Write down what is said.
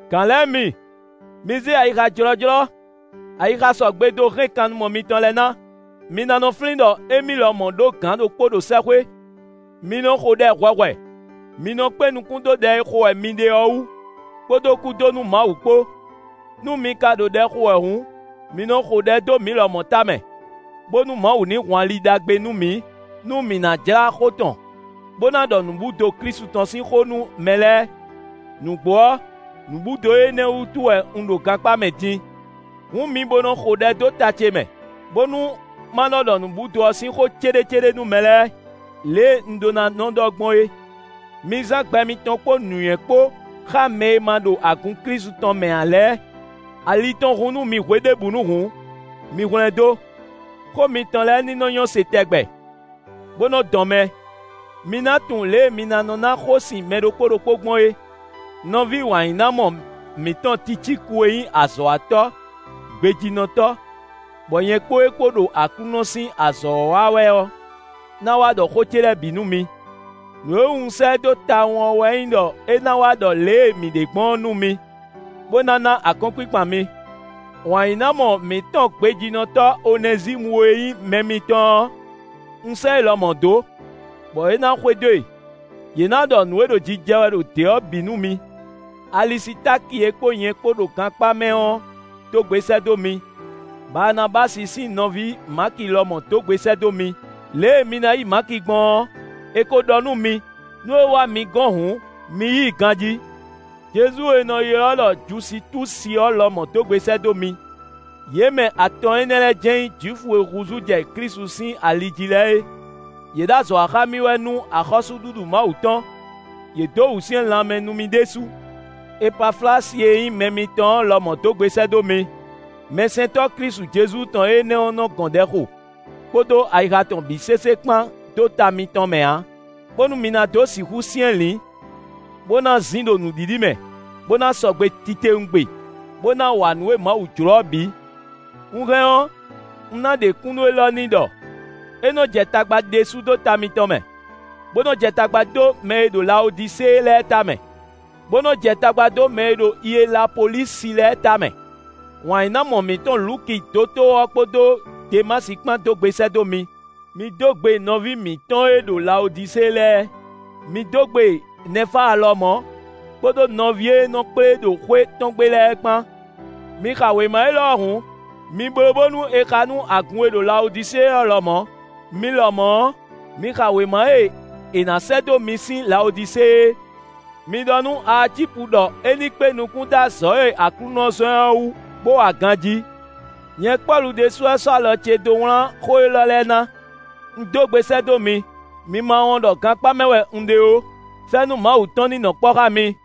Gǎn lɛ́ɛ mi, mi zé ayixa jlɔ́jlɔ́, ayixa sɔgbe dó hɛn kannumɔ mitɔn lɛ́ɛ ná. Mi ná nɔ flín ɖɔ émí lɔmɔ̌ ɖó gǎn ɖokpó ɖo sɛ́xwé. Mi nɔ xo ɖɛ hwɛhwɛ; mi nɔ kpé nukún dó ɖɛ e xo wɛ mi ɖe ɔ́ wú, kpódó kú dó nú Mawu kpó. Nú mi ka ɖo ɖɛ xo wɛ hǔn, mi nɔ xo ɖɛ dó mǐ lɔmɔ̌ tamɛ, bónú Mawu ní hun ali ɖagbe nú mǐ, nú mǐ ná jlá xó tɔn, bó ná ɖɔ nǔbúdo Klísu tɔn sín xó nú mɛ lɛ́ɛ. Nǔgbó ɔ́, nǔbúdo énɛ́ wútu wɛ un ɖo gankpá mɛ din. Hǔn mi bo nɔ xo ɖɛ dó ta ce mɛ, bónú ma nɔ ɖɔ nǔbúdo ɔ́ sín xó céɖécéɖé nú mɛ lɛ́ɛ, lě e un ɖó ná nɔ ɖɔ gbɔn é. Mi zán gbɛ mitɔn kpó nǔnywɛ́ kpó xá mɛ e ma ɖo agun Klísu tɔn mɛ ǎ lɛ́ɛ; ali tɔn hun nú mi hweɖěbǔnu hǔn, mi hwlɛ́ndó. Xó mitɔn lɛ́ɛ ní nɔ nyɔ́ se tɛgbɛ, bó nɔ́ dɔn mɛ; mi ná tunwun lě e mi ná nɔ́ ná xósin mɛ ɖokpó ɖokpó gbɔn é. Nɔví wǎnyínámɔ mǐtɔn Ticíku e nyí azɔ̌watɔ́ gbejínɔtɔ́, bɔ nyɛ kpó é kpó ɖo Aklúnɔ sín azɔ̌ ɔ́ wa wɛ ɔ́, ná wá ɖɔ xó ce lɛ́ɛ bǐ nú mi. Nǔ e wú un sɛ́ ɛ dó tawun ɔ́ wɛ nyí ɖɔ é ná wá ɖɔ lě e mǐ ɖe gbɔn ɔ́ nú mi, bó ná ná akɔ́nkpinkpan mi. Wǎnyínámɔ mǐtɔn gbejínɔtɔ́ Onɛzímu e nyí mɛ mitɔn ɔ́, un sɛ́ é lɔmɔ̌ dó, bɔ é ná xwedó e; yě ná ɖɔ nǔ e ɖo jijɛ wɛ ɖo dě ɔ́ bǐ nú mi. Alisitáki e kpó nyɛ kpó ɖo gankpá mɛ ɔ́ dó gbe sɛ́ dó mi; Baanabási sín nɔví Maki lɔmɔ̌ dó gbe sɛ́ dó mi. Lě e mi ná yí Maki gbɔn ɔ́, è ko ɖɔ nú mi; nú é wá mi gɔ́n hǔn, mi yí i ganjí. Jezu e è nɔ ylɔ́ ɖɔ Jusitúsi ɔ́ lɔmɔ̌ dó gbe sɛ́ dó mi. Yě mɛ atɔn énɛ́ lɛ́ɛ jɛ́n nyí Jwifu e húzú jɛ Klísu sín ali jí lɛ́ɛ é; yě ɖo azɔ̌ wa xá mì wɛ nú axɔ́súɖuɖu Mawu tɔn. Yě dó wǔsyɛ́n lanmɛ nú mì ɖésú. Epaflasi e nyí mɛ mitɔn ɔ́ lɔmɔ̌ dó gbe sɛ́ dó mi; mɛsɛntɔ́ Klísu Jezu tɔn énɛ́ ɔ́ nɔ gɔn ɖɛ xo, kpódó ayixa tɔn bǐ sésé kpán dó ta mitɔn mɛ ǎ, bónú mi ná dó sixú syɛ́nlǐn, bó ná zin ɖo nǔɖiɖi mɛ, bó ná sɔgbe titewungbe, bó ná wa nǔ e Mawu jló ɔ́ bǐ. Un hɛn ɔ́, un ná ɖe kúnnu élɔ́ n'i ɖɔ: é nɔ jɛ tagba ɖésú dó ta mitɔn mɛ, bó nɔ jɛ tagba dó mɛ e ɖo Lawodisée lɛ́ɛ tamɛ, bó nɔ jɛ tagba dó mɛ e ɖo Ielapólisi lɛ́ɛ tamɛ. Wǎnyínámɔ mǐtɔn Luki dotóo ɔ́ kpódó Demási kpán dó gbe sɛ́ dó mi. Mi dó gbe nɔví mǐtɔn e ɖo Lawodisée lɛ́ɛ; mi dó gbe Nɛfáa lɔmɔ̌, kpódó nɔví e nɔ kplé ɖo xwé tɔn gbe lɛ́ɛ kpán. Mi xa wěma élɔ́ ɔ́ hǔn, mi bló bónú è xa nú agun e ɖo Lawodisée ɔ́ lɔmɔ̌. Mi lɔmɔ̌ ɔ́, mi xa wěma e è nǎ sɛ́ dó mi sín Lawodisée é. Mi ɖɔ nú Aacípu ɖɔ é ní kpé nukún dó azɔ̌ e Aklúnɔ zɔ́n ɛ ɔ́ wú bó wa ganjí. Nyɛ Pɔ́lu ɖésú wɛ sɔ́ alɔ ce dó wlán xó élɔ́ lɛ́ɛ ná: Un dó gbe sɛ́ dó mi; mi ma wɔn ɖɔ gankpá mɛ wɛ un ɖe ó. Fɛ́nú Mawu tɔn ní nɔ kpɔ́ xá mi.